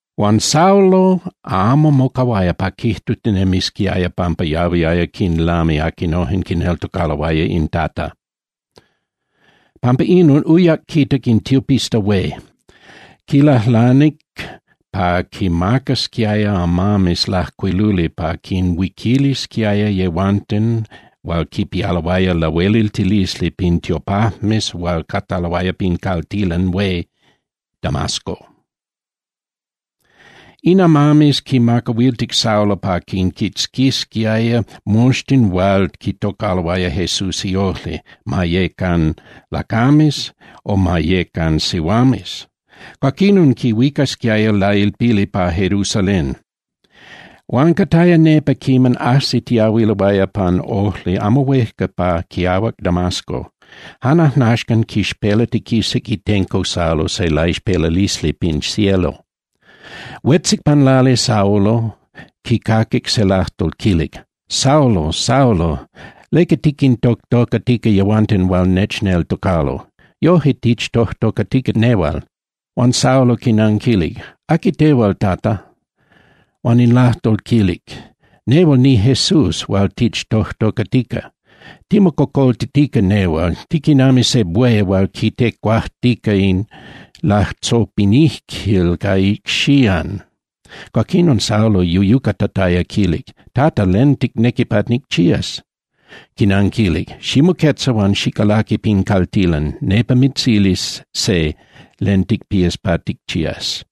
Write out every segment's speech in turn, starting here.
Huan Saulo amo mocahuaya pa quijtutinemisquiaya pampa yahuiaya quinlami aquinojen quineltocaloaya in Tata. Pampa inon uyac quitac in tiopista hué. Quilajlanic pa quimacasquiaya amames lajcuiluli pa quinhuiquilisquiaya yehuanten hual quipialoaya lahueliltilisli pin tiopajmes hual cataloaya pin caltilan hué Damasco. In amames quimacahuiltic Saulo pa quinquitzquisquiaya moxtin hual quitocaloaya Jesús iojli, ma yecan lacames o ma yecan sihuames. Cuaquinon quinhuicasquiaya lailpili pa Jerusalén. Huan cataya nepa quiman ajsitiahuiloaya pan ojli amo huejca pa quiahuac Damasco, jan ajnaxcan quixpelatiquisac itenco Saulo se laixpelalisli pin cielo. Huetzic pan lali Saulo, quicaquic se lajtol quilic: —Saulo, Saulo, ¿leca tiquintojtocatica yehuanten hual nechneltocalo? Yojque tichtojtocatica nehual. Huan Saulo quinanquilic: —¿Aqui tehual, Tata? Huan in lajtol quilic: —Nehual niJesús hual tictojtocatica. Timococoltitica tehual, tiquinami se buey hual quitecuajtica in latzopinijquil ca icxían. Cuaquinon Saulo yuyucatataya quilic: —Tata, ¿len ticnequi pa nicchías? Quinanquilic: —Ximoquetza huan xicalaqui pin caltilan, nepa mitzilis se len ticpías pa ticchías.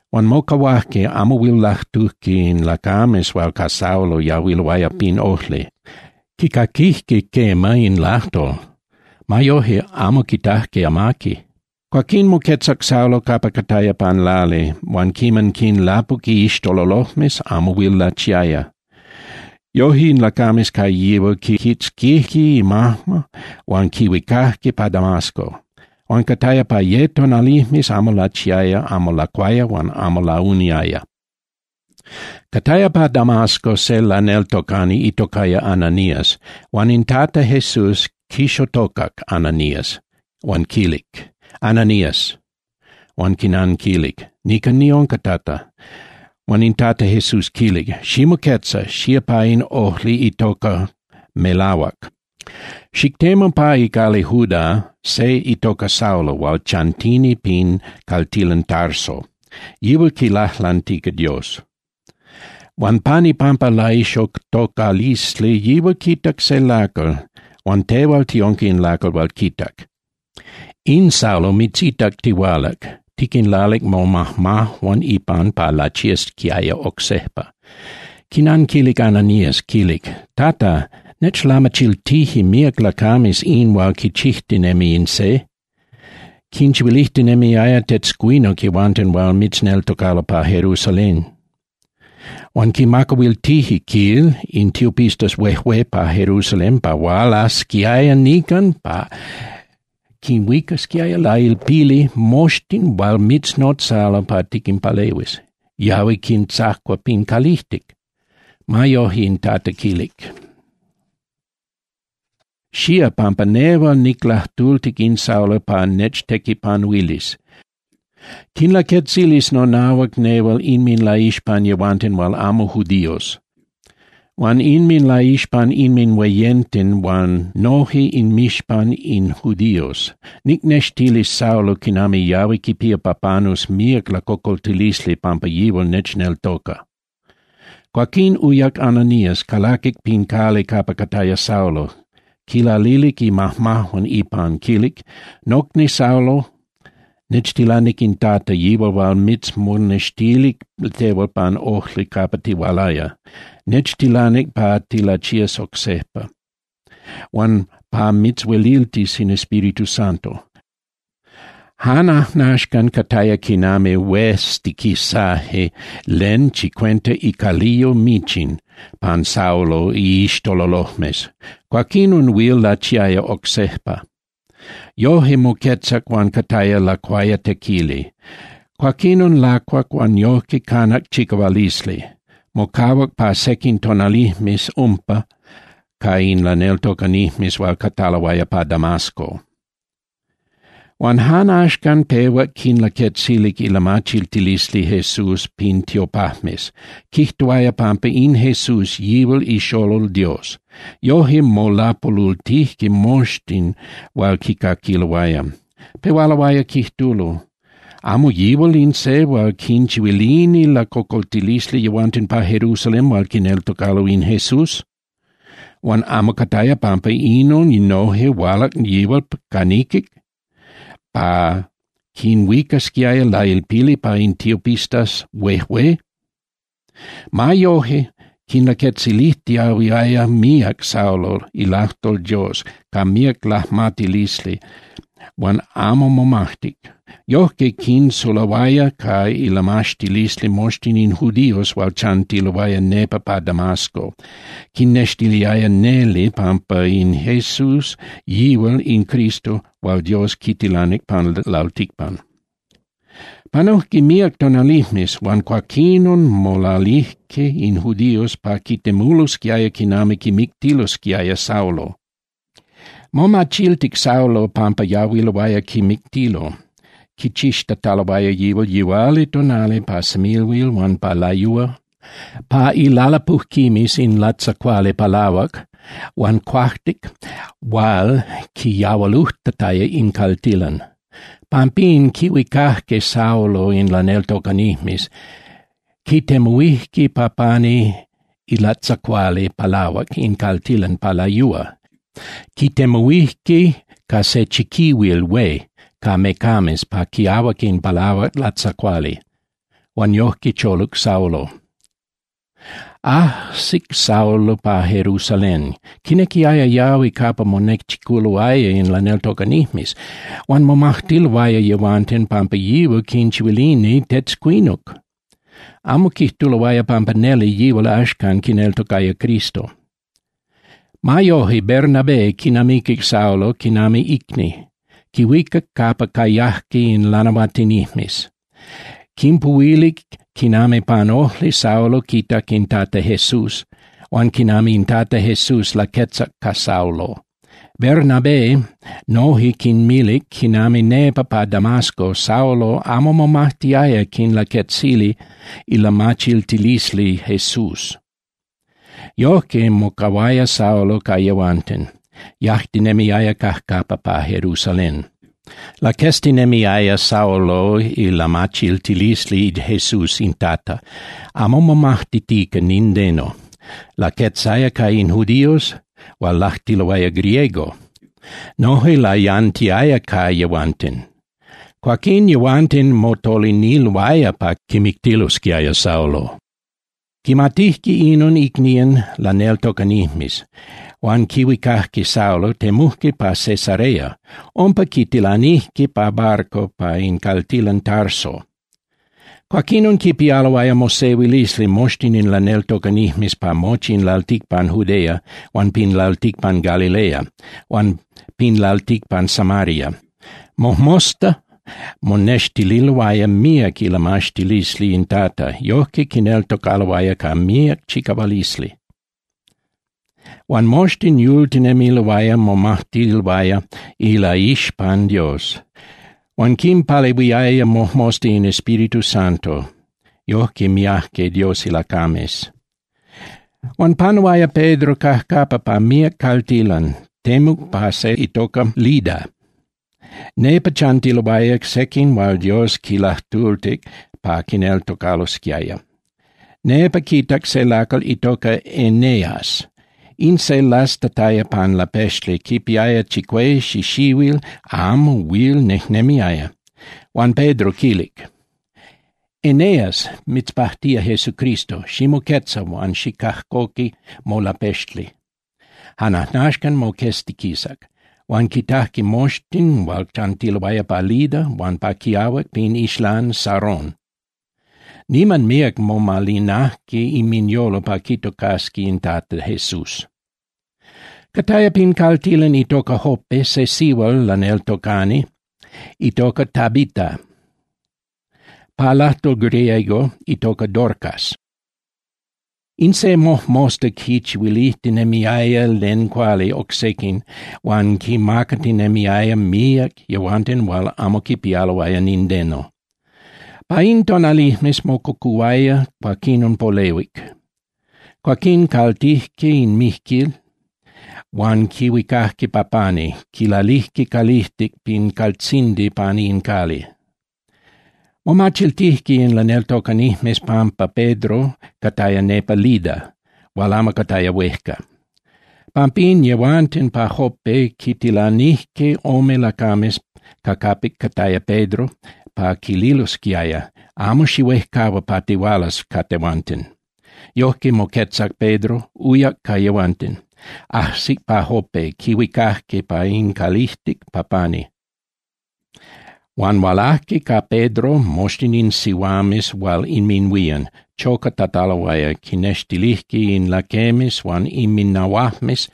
Huan mocahuajque, amo huil lajtujque in lacames hual ca Saulo yahuiloaya pin ojli. Quicaquijque quema in lajtol. Ma yoje amo quitajque amaqui. Cuaquín moquetzac Saulo capa cataya pan lali, huan quiman quinlapuc iixtololojmes amo huil lachiaya. Yoje in lacames ca yihual quiquitzquijque imajma huan quihuicajque pa Damasco. Huan cataya pa ye tonalijmes amo lachiaya, amo lacuaya huan amo launiaya. Cataya pa Damasco se laneltocani itocaya Ananías huan in Tata Jesús quixotocac Ananías huan quilic: —Ananías. Huan quinanquilic: —Nican niunca, Tata. Huan in Tata Jesús quilic: —Ximoquetza, xía pa in ojli itoca Melahuac, xictemu pa icali Juda se itoca Saulo hual chantini pin caltilan Tarso. Yihual quilajlantica Dios. Huan pan ipampa laixotocalisli yihual quitac se lacal, huan tehual tiunca in lacal hual quitac. In Saulo mitzitac tihualac, tiquinlalic momajmajuan ipan pa lachiasquiaya oc sejpa. Quinanquilic Ananías, quilic: —Tata, nechlamachiltije míac lacames in hual quichijtinemi in se. Quinchihuilijtinemiaya tetzcuinuc yehuanten hual mitzneltocalo pa Jerusalén. Huan quimacahuiltije, quil, in tiopistas huejué pa Jerusalén pa hualasquiaya nican pa quinhuicasquiaya lailpili moxtin hual mitznotzalo pa tiquinpalehuis. Yahui quintzacua pin calijtic. Ma yoje, in Tata quilic: —Xía, pampa nehual niclajtultic in Saulo pa nechtequipanuilis. Quinlaquetzilis nonahuac nehual inminlaixpan yehuanten hual amo judíos huan inminlaixpan inminhueyenten huan noje inmixpan in judíos. Nicnextilis Saulo quinami yahui quipía pa panus míac lacocoltilisli pampa yihual nechneltoca. Cuaquín uyac Ananías, calaquic pin cali capa cataya Saulo, quilalilic imajmajuan ipan, quilic: —Nocni Saulo, nechtilanic in Tata, yihual hual mitzmonextilic tehual pan ojli capa tihualaya. Nechtilanic pa tilachías oc sejpa, huan pa mitzhueliltis in Espíritu Santo. Jan ajnaxcan cataya quinami hueztiquisaje len chicuenta icaliyo michin pan Saulo iixtololojmes. Cuaquinon huil lachiaya oc sejpa. Yoje, moquetzac huan cataya lacuayatequili. Cuaquinon lacuac huan yojque canac chicahualisli. Mocahuac pa sequin tonalijmes umpa ca in laneltocanijmes hual cataloaya pa Damasco. Huan jan axcan pehuac quinlaquetzilic ilamachiltilisli Jesús pin tiopajmes, quijtuaya pampa in Jesús yihual ixolol Dios. Yoje, molapolultijque moxtin hual quicaquiloaya, pehualoaya quijtulo: —¿Amo yihual in se hual quinchihuilini lacocoltilisli yehuanten pa Jerusalén hual quineltocalo in Jesús? Huan ¿amo cataya pampa inon noje hualac yihual ca niquic pa quinhuicasquiaya lailpili pa in tiopistas huejué? Ma yoje, quinlaquetzilijtiahuiaya míac Saulo ilajtol Dios ca míac lajmatilisli huan amo momajtic. Yojque quinsulahuaya ca ilamaxtilisli moxtin in judíos hual chantiloaya nepa pa Damasco, quinnextiliaya neli pampa in Jesús yihual in Cristo hual Dios quitilanic pan lalticpan. Panujque míac tonalijmes, huan cuaquinon molalilijque in judíos pa quitemulosquiaya quinami quimictilosquiaya Saulo. Momachiltic Saulo pampa yahuiloaya quimictilo, quichixtataloaya yihual yihualitonali, pa semilhuil huan pa layúa, pa ilalapujquimes in latzacuali palahuac huan cuajtic hual quiyahualujtataya in caltilan. Pampín, quihuicajque Saulo in laneltocanijmes, quitemuhuijque pa pani ilatzacuali palahuac in caltilan pa layúa, quitemuhuijque ca se chiquihuil hué ca mecames pa quiahuac in palahuac latzacuali, huan yojque choluc Saulo. Ajsic Saulo pa Jerusalén, quinequiaya yahui capa monechiculoaya in laneltocanijmes, huan momajtiloaya yehuanten pampa yihual quinchihuilini tetzcuinuc, amo quijtuloaya pampa neli yihual axcan quineltocaya Cristo. Ma yoje, Bernabé quinamiquic Saulo quinami icni, quihuicac capa cayajque in lanahuatinijmes, quinpuhuilic quinami pan ojli Saulo quitac in Tata Jesús huan quinami in Tata Jesús laquetzac ca Saulo. Bernabé noje quinmilic quinami nepa pa Damasco Saulo amo momajtiaya quinlaquetzili ilamachiltilisli Jesús. Yojque, mocahuaya Saulo ca yehuanten, yajtinemiaya cajcapa pa Jerusalén. Laqueztinemiaya Saulo ilamachiltilisli Jesús in Tata, amo momajtitica nindeno. Laquetzaya ca in judíos hual lajtuloaya griego, noje layantiaya ca yehuanten. Cuaquín yehuanten motoliniloaya pa quimictilosquiaya Saulo. Quimatijque inon icnían laneltocanijmes, huan quihuicajque Saulo, temujque pa Cesarea. Umpa quitilanijque pa barco pa in caltilan Tarso. Cuaquinon quipialoaya mosehuilisli moxtin in laneltocanijmes pa mochi in lalticpan Judea huan pin lalticpan Galilea huan pin lalticpan Samaria. Mojmosta monextililoaya míac ilamaxtilisli in Tata, yojque quineltocaloaya ca míac chicahualisli. Huan moxtin yultinemiloaya momajtiloaya ilaixpan Dios. Huan quinpalehuiaya mojmosta in Espíritu Santo, yojque miajque Dios ilacames. Huan panuaya Pedro cajcapa pa míac caltilan, temuc pa se itoca Lida, nepa chantiloaya sequin hual Dios quinlajtultic pa quineltocalosquiaya. Nepa quitac se lacal itoca Eneas. In se lastataya pan lapexli quipiaya chicue xixihuil amo huil nejnemiaya. Huan Pedro quilic: —Eneas, mitzpajtía Jesucristo. Ximoquetza huan xicajcoqui molapexli. Jan ajnaxcan moqueztiquisac. Huan quitajque moxtin hual chantiloaya pa Lida huan pa quiahuac pin ixlán Sarón. Niman míac momalinajque inminyolo pa quitocasqui in Tata Jesús. Cataya pin caltilan itoca Jope se sihual laneltocani itoca Tabita. Pa lajtol griego itoca Dorcas. In se mojmosta quinchihuilijtinemiaya len cuali oc sequin huan quinmacatinemiaya míac yehuanten hual amo quipialoaya nindeno. Pa in tonalijmes mococuhuaya, cuaquinon polehuic. Cuaquín caltijque in mijquil huan quihuicajque pa pani, quilalijque calijtic pin caltzindi pani in cali. Momachiltijque in laneltocanijmes pampa Pedro cataya nepa Lida hual amo cataya huejca. Pampín yehuanten pa Jope quintilanijque ome lacames ca capic cataya Pedro pa quililosquiaya: —Amo xihuejcahua pa tihualas ca tehuanten. Yojque moquetzac Pedro, uyac ca yehuanten. Ajsic pa Jope, quihuicajque pa in calijtic pa pani. Huan hualajque ca Pedro moxtin in sihuames hual inminhuían, chocatataloaya, quinextilijque in laquemes huan inminahuajmes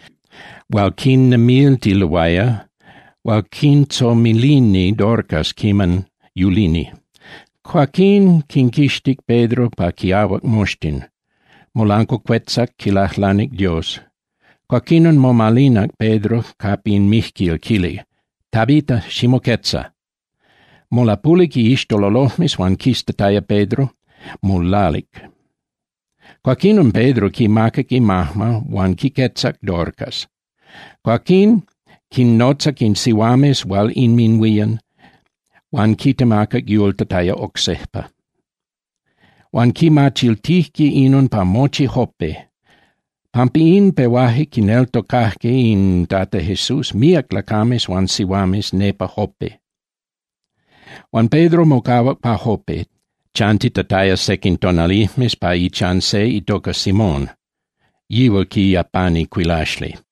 hual quinnemiltiloaya, hual quintzomilini Dorcas quiman yulini. Cuaquín quinquixtic Pedro pa quiahuac moxtin, molancuacuetzac quilajlanic Dios. Cuaquinon momalinac Pedro capa in mijquil, quilic: —Tabita, ximoquetza. Molapulic iixtololojmes huan quiztataya Pedro, molalic. Cuaquinon Pedro quimacac imajma huan quiquetzac Dorcas. Cuaquín quinnotzac in sihuames hual inminhuían huan quitemacac yultataya oc sejpa. Huan quimachiltijque inon pa mochi Jope. Pampa in, pehuaje quineltocajque in Tata Jesús míac lacames huan sihuames nepa Jope. Huan Pedro mocahuac pa Jope, chantitataya sequin tonalijmes pa ichan se itoca Simón, yihual quiyapani cuilaxli.